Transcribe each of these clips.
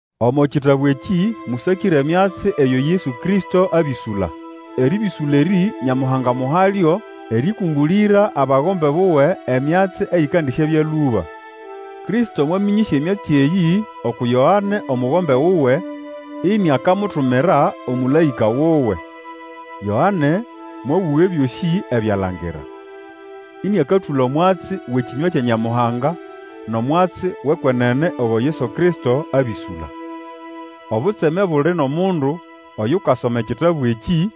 Omo kitabu ekĩ mũsakĩre emyatsi eyo Yesu Kristo abĩsũla. Erĩbĩsũla erĩ Nyamuhanga amuhalyo erĩkũmbũlĩra abagombe buwe emyatsi eyikandisyabya lũba. Kristo mwamĩnyĩsya emyatsi eyĩ uku Yoane omugombe wuwe iniakamutumira omũlaĩka wuwe. Yoane mwabũga ebyosĩ ebyo alangira, ĩnĩakatũla omwatsi wʼekĩnywa kya Nyamuhanga nʼomwatsi wʼekwenene ogo Yesu Kristo abĩsũla. Obutseme buli nʼomundu oyukasoma ekitabu ekĩ,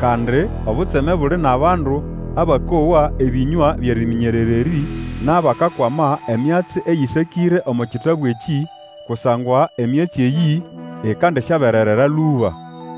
kandi obutseme buli nʼabandu abakowa ebĩnywa byʼeriminyerera erĩ, nʼabakakwama emyatsi eyĩsakĩre omo kitabu ekĩ! Kusangwa emyatsi eyĩ ikandisyabererera lũba.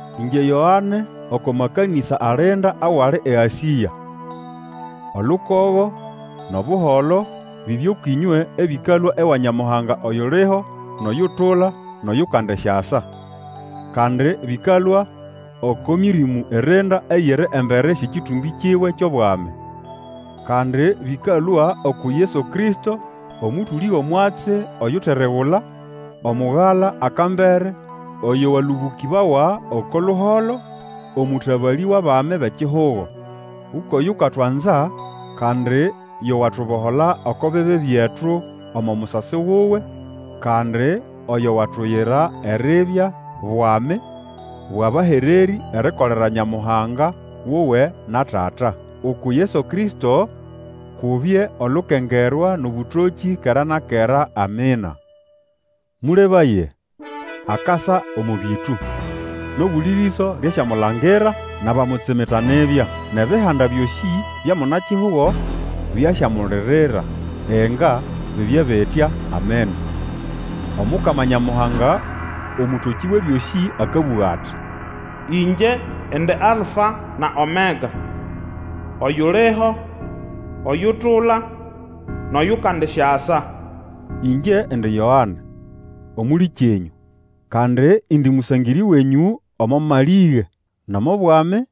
Ĩngye Yoane oko makanĩsa alinda awali eAsĩa: Olukogo nʼobuholo bibye kwĩnywe ebĩkalũa ewa Nyamuhanga, oyuliho, nʼoyutula, nʼoyukandisyasa. Kandi bĩkalũa oko Mĩrĩmũ irinda eyiri embere syʼekĩtũmbĩ kiwe kyʼobwami; kandi bĩkalũa uku Yesu Kristo, omũtũlĩ wʼomwatsi oyuteregula, Omugala, akambere oyo walũbũkĩbawa oko luholo, omũtabalĩ, wʼabami bʼekihugo. Ukwʼoyukatwanza, kandi yo watubohola oko bibi byetu omo musasi wuwe, kandi oyo watuyira eribya bwami bwʼabahererĩ erikolera Nyamuhanga wuwe na Tata. Uku Yesu Kristo kubye olukengerwa, nʼobũtokĩ, kera na kera! Amina. Mũlebaye! Akasa omo bĩtũ! Nʼobuli rĩso nʼasyamulangira, nʼabamutsimita nibya. Nʼebihanda byosĩ bya muna-kihugo byasyamulirira. Inga, bibye bitya! Amina. Omukama Nyamuhanga, Omũtokĩ Wʼebyosĩ, akabũga ati, Ĩngye indi Alfa na Omega; oyuliho, oyutula, nʼoyukandisyasa. Ĩngye indi Yoane, omũlĩkyenyũ, kandi indi mũsangĩrĩ wenyũ omo malĩge, nʼomo bwami,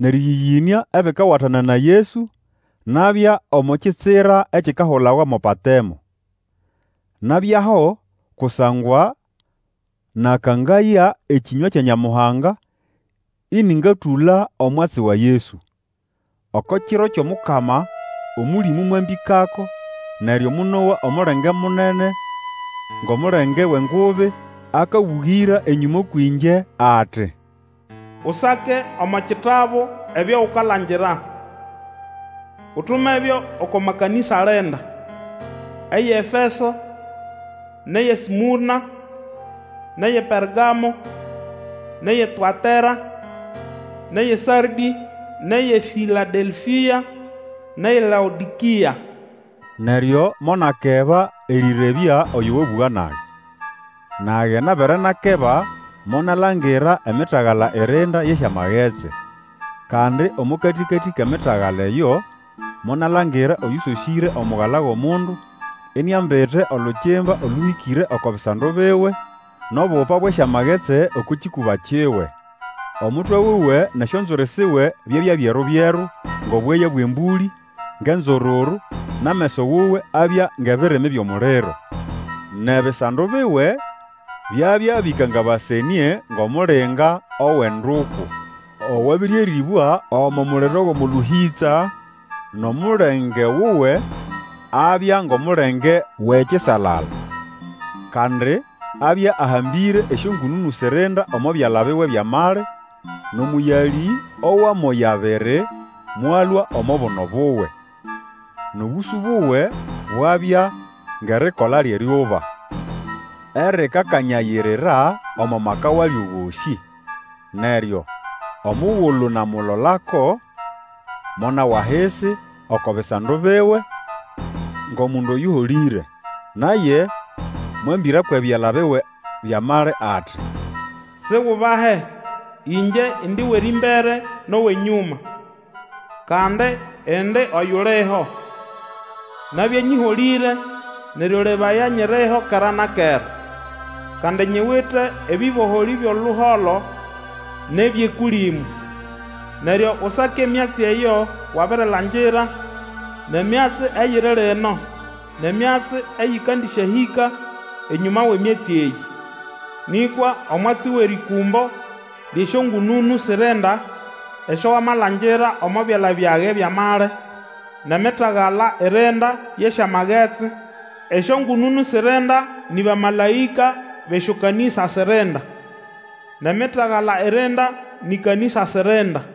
nʼerĩyĩyĩnĩa, ebikawatana na Yesu, nabya omo kitsira ekikahulawa mo Patemo. Nabyaho kusangwa nakangaya ekĩnywa kya Nyamuhanga, ĩnĩngatũla omwatsi wa Yesu. Oko kiro kyʼomukama, Omũlĩmũ mwambĩkako, neryo monowa omulenge munene ngʼomulenge wʼengubi akabũgĩra enyũma kwĩngye. Ati, Usake omo kitabu ebyo ukalangira, utumebyo oko makanĩsa alinda: EyʼeEfeso, nʼeyʼeSmũrna, nʼeyʼePergamo, nʼeyʼeTũatera, nʼeyʼeSardĩ, nʼeyʼeFĩladelfĩa, nʼeyʼeLaodĩkĩa. Neryo monakeba erĩrebya oyo wabũga nage. Nage nabere nakeba monalangira emitagala irinda yʼesyamagetsi. Kandi omo katĩkatĩ kʼemitagala eyo, monalangira oyũsosĩre Omugala wʼOmundu, iniambite olukimba olũhĩkĩre oko bisando biwe, nʼobupa bwʼesyamagetsi oko kĩkũba kiwe. Omutwe wuwe nʼesyonzwiri siwe byabya byeru-byeru ngʼobweya bwʼembũlĩ, ngʼenzururu, nʼameso wuwe abya ngʼebirimi byʼomuliro. Nʼebisando biwe byabya bĩkangabasenĩe ngʼomulinga owʼenduku, owabĩrĩerĩbwa omo muliro wʼomo lũhĩtsa, nʼomulenge wuwe abya ngʼomulenge wʼekisalala. Kandi abya ahambĩre esyongũnũnũ sirinda omo byala biwe byʼamali, nʼomũyalĩ owʼamoya abiri mwalũa omo buno buwe. Nʼobũsũ buwe bwabya ngʼerikola lyʼeryuba erikakanyayira omo maka walyo gosĩ. Neryo omugulu namulolako, monawa ahisi oko bisando biwe ngʼomundu oyũholĩre. Naye mwambĩra kwʼebyala biwe byʼamali, ati, Sigubahe, ĩngye indi wʼerĩmbere nʼowʼenyũma. Kandi indi oyuliho! Nabya nyĩholĩre, neryo lebaya, nyiriho kera na kera. Kandi nyiwite ebĩboholĩ byʼoluholo nʼebyʼEkũlĩmũ. Neryo Usake emyatsi eyo wabirilangira, nʼemyatsi eyiri lino, nʼemyatsi eyĩkandĩsyahĩka enyũma wʼemyatsi eyĩ. Nĩkwa omwatsi wʼerĩkũmbo lyʼesyongũnũnũ sirinda esyo Wamalangira omo byala byage byʼamali, nʼemitagala irinda yʼesyamagetsi: esyongũnũnũ sirinda ni bamalaĩka bʼesyokanĩsa sirinda, nʼemitagala irinda nĩ kanĩsa sirinda.